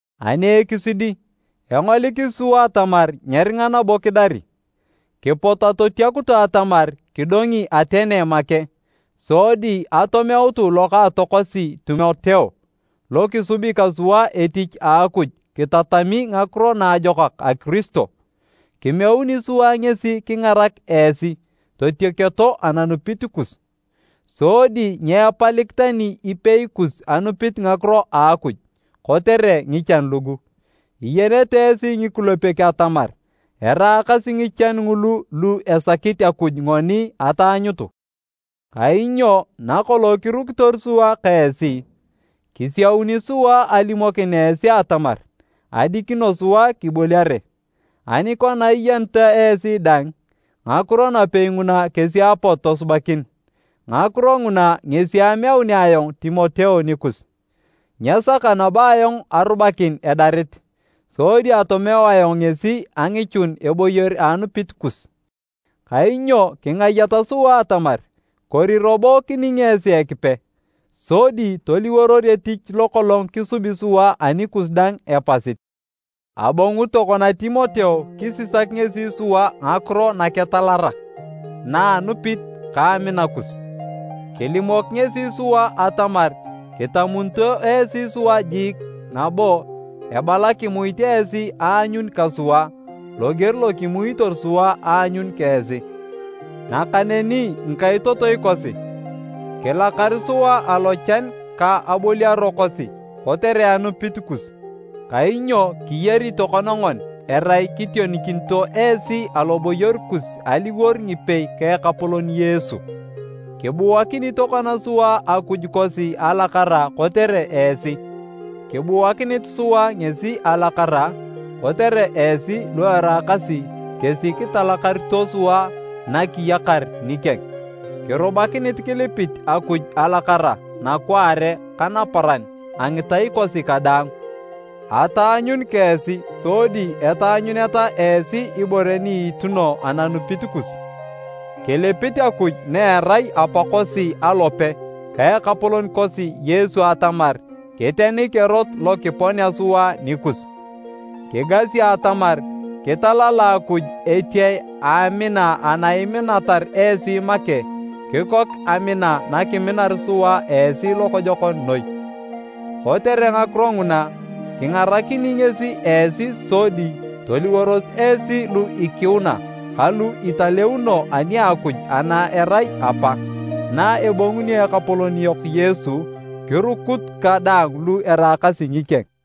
Ani ekisidi, engolikisi sua atamar nyeringa nabo kidari. Kipot atotiakutu atamar kidongi Atene make sodi atomeutu lokaatokosi Timoteo lo kisubi ka sua etich a Akuj kitatami Ngakiro Naajokak a Kiristo. Kimeuni sua ngesi kingarak esi totioketo ananupit kus, sodi nyeepalik tani ipei kus anupit ngakiro a Akuj kotere ngichan lugu. Iyenete esi ngikulepek atamar eraakasi ngichan ngulu lu esakit Akuj ngoni ataanyutu. Kainyo nakolong kirukitor sua ka esi, kisiauni sua alimokin esi atamar adikino sua kiboliare. Ani kona iyeneta esi dang, ngakiro napei nguna kesi apot tosubakin. Ngakiro nguna ngesi ameunea ayong Timoteo nikus. Nyesaka nabo ayong arubakin edarit, sodi atomeu ayong ngesi angichun eboyor a anupit kus. Kainyo kingayat sua atamar kori robo kining esi Ekipe sodi toliworor etich lokolong kisubi sua anikus daang epasit! Abongu tokona Timoteo kisisak ngesi sua ngakiro naketalakarak na a anupit ka amina kus. Kilimok ngesi sua atamar kitamunito esi sua jiik nabo ebala kimuit esi aanyun ka sua loger lo kimuitor sua aanyun ka esi. Nakaneni ngikaitotoi kosi, kilakar sua alochan ka aboliaro kosi kotere anupit kus. Kainyo kiyari tokona ngoni erai kitionikinito esi aloboyor kus aliwor ngipei ka Ekapolon Yesu. Kibuakini tokona sua Akuj kosi alakara kotere esi. Kibuakinit sua ngesi alakara kotere esi lu eraakasi kesi kitalakarito sua na kiyakar nikeng. Kirubakinit kilipit Akuj alakara nakwaare ka naparan a ngitai kosi kadaang ataanyun ka esi sodi etaanyuneta esi ibore ni iituno ananupit kus. Kilipit Akuj na erai Apakosi alope ka Ekapolon kosi Yesu atamar kitenik erot lo kiponea sua nikus! Kigasi atamar kitalala Akuj etiae a amina ana iminatar esi make kikok amina nakiminar sua esi lokojokon noi. Kotere ngakiro nguna, kingarakini ngesi esi sodi toliworos esi lu ikiuna ka lu italeuno ani a Akuj ana erai Apa, na ebongunio Ekapolon yok Yesu kirukut ka daang lu eraakasi ngikeng.